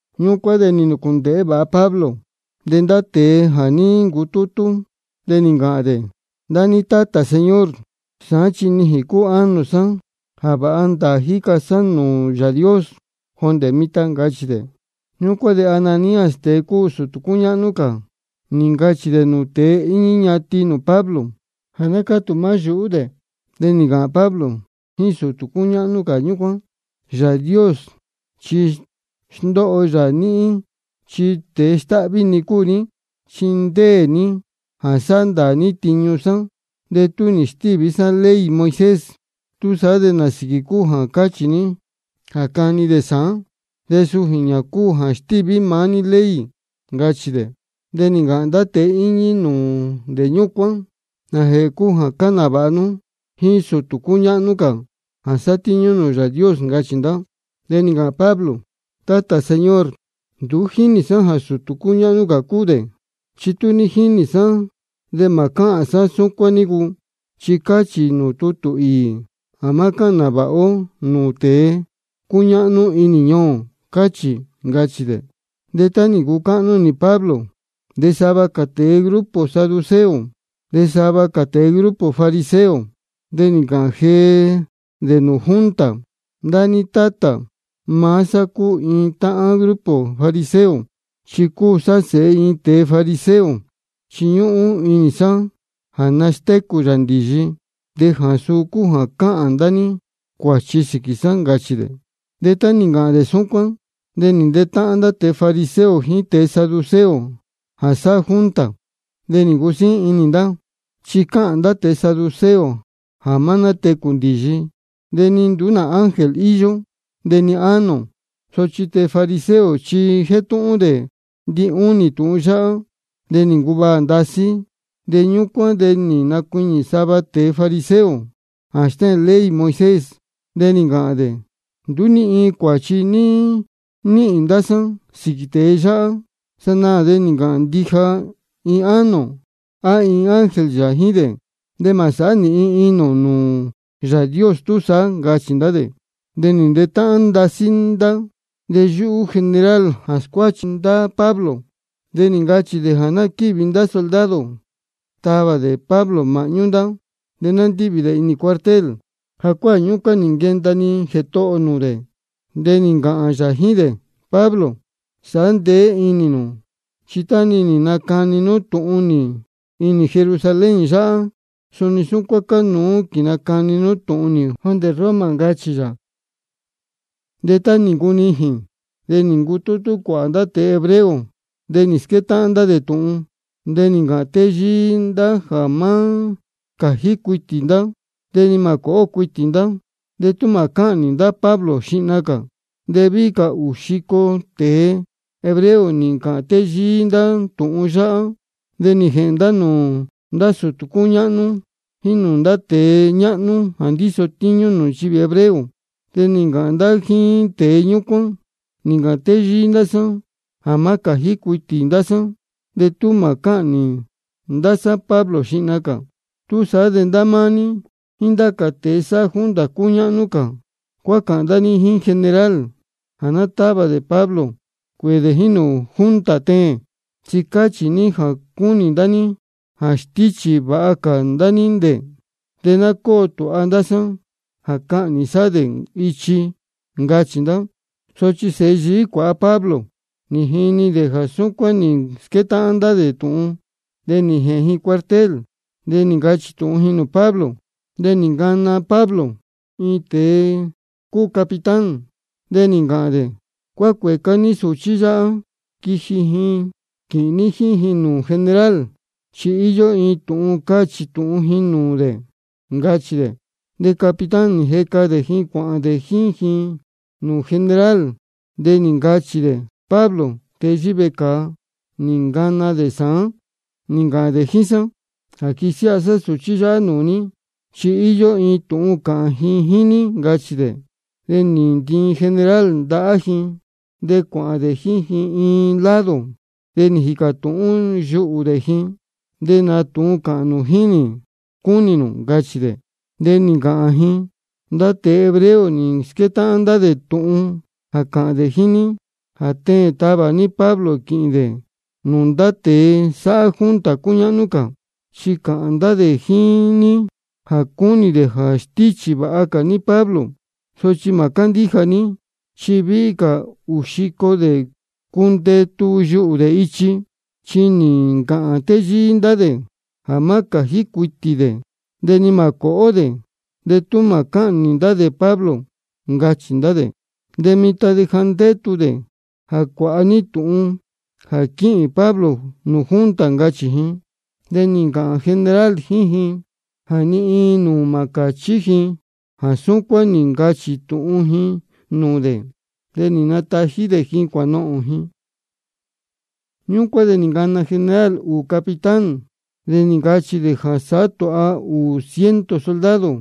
Ñúcuán de nī nūcūndēhé vāha Pablo nūū ndá tēe jā ní ncutútú, de nī ncāhān dē: Ndá ní tátā, señor, sāán chi nijīn cúu ánō sá jā vāha ndāā jíca sá nūū Yāā Dios jondē mitan, ncachī dē. Ñúcuán de Ananías, tēe cúu sūtū cúñáhnú cā, nī ncachī dē nūū tēe íñí ñatin nūū Pablo jā ná cátū maá yuhú dē. De nī ncāhān Pablo jíín sūtū cúñáhnú cā ñúcuán: Yāā Dios chi sndóho yā níhín chi tēe stáhví-ni cúu ní. Chi ndéē ní jā sāhá ndāā ní tiñu sá de tú nī stíví sá ley Moisés. ¿Túsaá de nā sīquī cúu jā cáchī ní jā cani dē sāán? Chi suu jīñā cúu jā stíví maá ní ley, ncachī dē. De nī ncāhān ndá tēe íñí nūū dē ñúcuán: ¿Nājēhē cúu jā cáhān nāvāha nú jíín sūtū cúñáhnú cā jā sátíñú nūū Yāā Dios? ncachī ndá. De nī ncāhān Pablo: Tátā, señor, nduú ní jínī sá jā sūtū cúñáhnú cā cúu dē. Chi tú ní jínī sá de mā cáhān sá súcuán nícu, chi cáchī nūū tútū īī jā má cáhān nāvāha ó nūū tēe cúñáhnú inī ñuū ō, cáchī, ncachī dē. De tá nī ncucáhnú inī Pablo jā sava dē cúu tēe grupo saduceo de sava cā dē cúu grupo fariseo, de nī ncāhān jee dē nūū junta: Ndá níhín tátā, maá sá cúu iin táhán grupo fariseo, chi cúu sá sēhe iin tēe fariseo. Chi ñúhún inī sá jā nastécū yā ndīyi, de jā suu cúu jā cáhān ndá ní cuāchi sīquī sá, ncachī dē. De tá nī ncāhān dē súcuán de nī ntetáhán ndá tēe fariseo jíín tēe saduceo jā sáhá junta. De nī ncusíín inī ndá. Chi cáhān ndá tēe saduceo jā má nátecū ndīyi de ni nduú nā ángel yā íyó de ni ánō. Sochi tēe fariseo chi jétúhún dē ndinúnī tūhun yáhá. De nī ncuvaā ndasí. De ñúcuán de nī nacuiñī sava tēe fariseo jā stéhēn ley Moisés, de nī ncāhān dē: Nduú ni iin cuāchi níhīn ndá sá sīquī tēe yáhá. Sanaā de nī ncāhān ndija iin ánō á iin ángel yā jíín dē, de mā sāhá nīhin inī ō nūū Yāā Dios túsaá, ncachī ndá dē. De nī ntetáhán ndasí ndá. De yúhú general jā scuáchi ndá Pablo de nī ncachī dē jā ná quívi ndá soldado tavā dē Pablo māhñú ndá, de ná ndívi dē inī cuartel. De jacuáā ñúcuán nī nquenda-ni Jētohō ō nūū dē, de nī ncāhān yā jíín dē: Pablo, sāhá ndeé inī nū, chi tá-ni nī nacani nú tūhun nī inī Jerusalén yáhá, suni súcuán cánuú quīnacani nú tūhun nī jondē Roma, ncachī yā. De tá nī ncunijīn de nī ncutútú cuāhā ndá tēe hebreo de nī squétáhán ndá tūhun. De nī ncāhān téyíí ndá jā má cājí cuitī ndá de ni mā cōhó cuitī ndá de tú mā cáhnī ndá Pablo xihna cā. De víhí cā ūū xico tēe hebreo nī ncāhān téyíí ndá tūhun yáhá. De nī jēhēn ndá nūū ndá sūtū cúñáhnú jíín nūū ndá tēe ñáhnú jā ndíso tíñú nūū nchivī hebreo, de nī ncāhān ndá jíín tēe ñúcuán: Nī ncāhān téyíí ndá sá jā má cājí cuitī ndá sá de tú mā cáhnī ndá sá Pablo xihna cā. Túsaá de ndá máá ní jíín ndá cā tēe sáhá junta cúñáhnú cā, cuácāhān ndá ní jíín general jā ná távā dē Pablo cuēē dē jíín nūū junta teēn, chi cachī ní jā cúnī ndá ní jā stíchī vāha cā ndá ní dē. De ná cóo tūha ndá sá jā cahnī sá dē ichi, ncachī ndá. Sochi sēhe yií cuāha Pablo nī jini ji jā súcuán nī squétáhán ndá tūhun. De nī jēhēn ji cuartel, de nī ncachī tūhun ji nūū Pablo. De nī ncana Pablo iin tēe cúu capitán, de nī ncāhān dē: Cueca ní sūchí yáhá quīhīn ní jíín ji nūū general, chi íyó iin tūhun cachī tūhun ji nūū dē, ncachī dē. De capitán nī jeca dē ji cuāhān ji jíín dē nūū general, de nī ncāhān dē: Pablo, tēe yíhí vecāa, nī ncana dē sāán nī ncāhān dē jíín sá jā quisiáha sá sūchí yáhá nūū ní, chi íyó iin tūhun cāhān ji jíín ní, ncachī dē. De nī ntiin general ndahá ji de cuāhān dē jíín ji iin lado, de nī jīcā tūhún yuhú dē ji: ¿De nā tūhun cāhān nū jíín nī cúnī nū? ncachī dē. De nī ncāhān ji: Ndá tēe hebreo nī squétáhán ndá dē tūhun jā cāhān dē jíín ní jā teēn tavā ní Pablo quīhīn dē nūū ndá tēe sáhá junta cúñáhnú cā, chi cāhān ndá dē jíín ní jā cúnī dē jā stíchī vāha cā dē Pablo. Sochi mā cándíja ní, chi víhí cā ūū xico dē cundetu yuhū dē ichi. Chi nī ncāhān téyíí ndá dē jā má cājí cuitī dē de ni mā cōhó dē de tú mā cáhnī ndá dē Pablo, ncachī ndá dē. De mitan ja ndétu dē jā cuāha ní tūhun jā quíhīn Pablo nūū junta, ncachī ji. De nī ncāhān general jíín ji jā ni iin nūū mā cāchí ji jā súcuán nī ncachī tūhun ji nūū dē, de nī natají dē ji cuānohōn ji. Ñúcuán de nī ncana general ūū capitán, de nī ncachī dē jā sāhá tūha dē ūū ciento soldado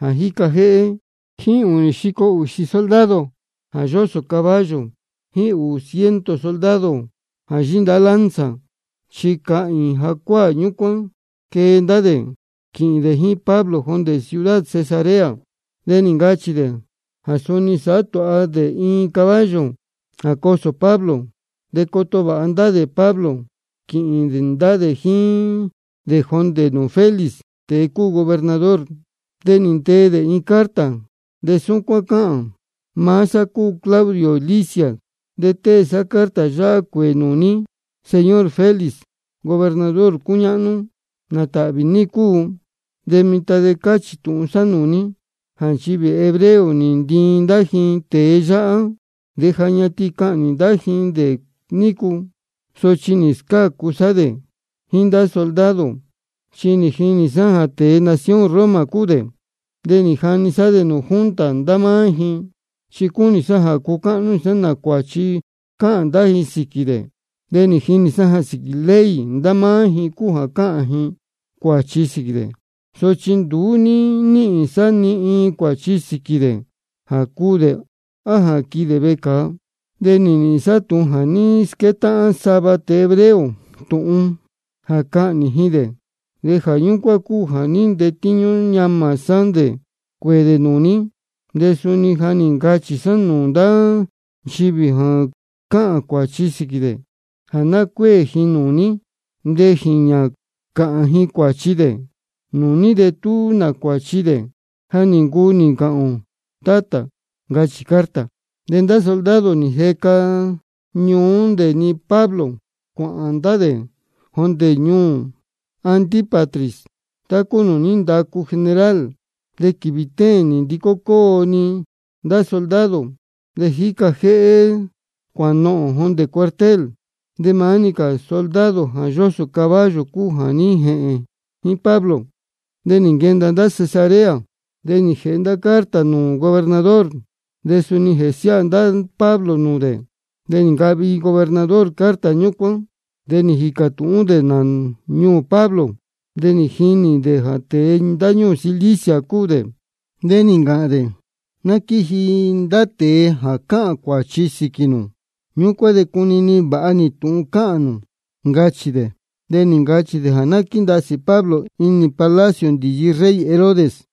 jā jíca jéhé jíín ūnī xico ūxī soldado jā yósō caballo jíín ūū ciento soldado jā yíndahá lanza. Chi cahīīn jacuáā ñúcuán quee ndá dē quīhīn dē jíín Pablo jondē ciudad Cesarea. De nī ncachī dē jā suni sāhá tūha dē iin caballo jā cosō Pablo. De coto vāha ndá dē Pablo quīhīn ndá dē jíín dē jondē nūū Félix, tēe cúu gobernador. De nī ntee dē iin carta, de súcuán cáhān: Maá sá cúu Claudio Lisias, de tée sá carta yáhá cuēē nūū ní, señor Félix, gobernador cúñáhnú. ¿Nā tāhvī ní cúu? De mitan de cáchī tūhun sá nūū ní jā nchivī hebreo nī ntiin ndá ji tēe yáhá. De ja ñatin cahnī ndá ji dē nícu, sochi nī scácu sá dē jíín ndá soldado, chi nī jinī sá jā tēe nación Roma cúu dē. De nī jani sá dē nūū junta ndá máá ji, chi cúnī sá cucáhnú inī sá nā cuāchi cáhān ndá ji sīquī dē. De nī jinī sá jā síquī ley ndá máá ji cúu jā cáhān ji cuāchi sīquī dē, sochi nduú ní níhīn sá ni iin cuāchi sīquī dē jā cuū dē á jā quihi dē vecāa. De nī nīhīn sá tūhun jā ní squétáhán sava tēe hebreo tūhun jā cahnī ji dē, de jā ñúcuán cúu jā ní ntetíñú ñamā sá dē cuēē dē nūū ní. De suni ja nī ncachī sá nūū ndá nchivī jā cáhān cuāchi sīquī dē jā ná cuéē ji nūū ní de jīñā cāhān ji cuāchi dē nūū ní de tú nā cuāchi dē. Ja nī ncuu nī ncāhān ō, tátā, ncachī carta. De ndá soldado nī jeca ñuú dē-ni Pablo cuāhān ndá dē jondē ñuū Antípatris tá cúu nūū ní ndacu general. De quīvī téēn nī ndicó cóo-ni ndá soldado jā jíca jéhé cuānohōn jondē cuartel, de maá-ni cā soldado jā yósō caballo cúu jā ní jēhēn jíín Pablo. De nī nquenda ndá Cesarea. De nī jēhe ndá carta nūū gobernador, de suni nī nsiáha ndá Pablo nūū dē. De nī ncahvi gobernador carta ñúcuán. De nī jīcā tūhún dē nā ñuū Pablo, de nī jinī dē jā tēe ndáñúū Cilicia cúu dē. De nī ncāhān dē: Ná quíji ndá tēe jā cáhān cuāchi sīquī nū. Ñúcuán de cunini vāha nī tūhun cāhān nū, ncachī dē. De nī ncachī dē jā ná quíndasī Pablo inī palacio ndīyi rey Herodes.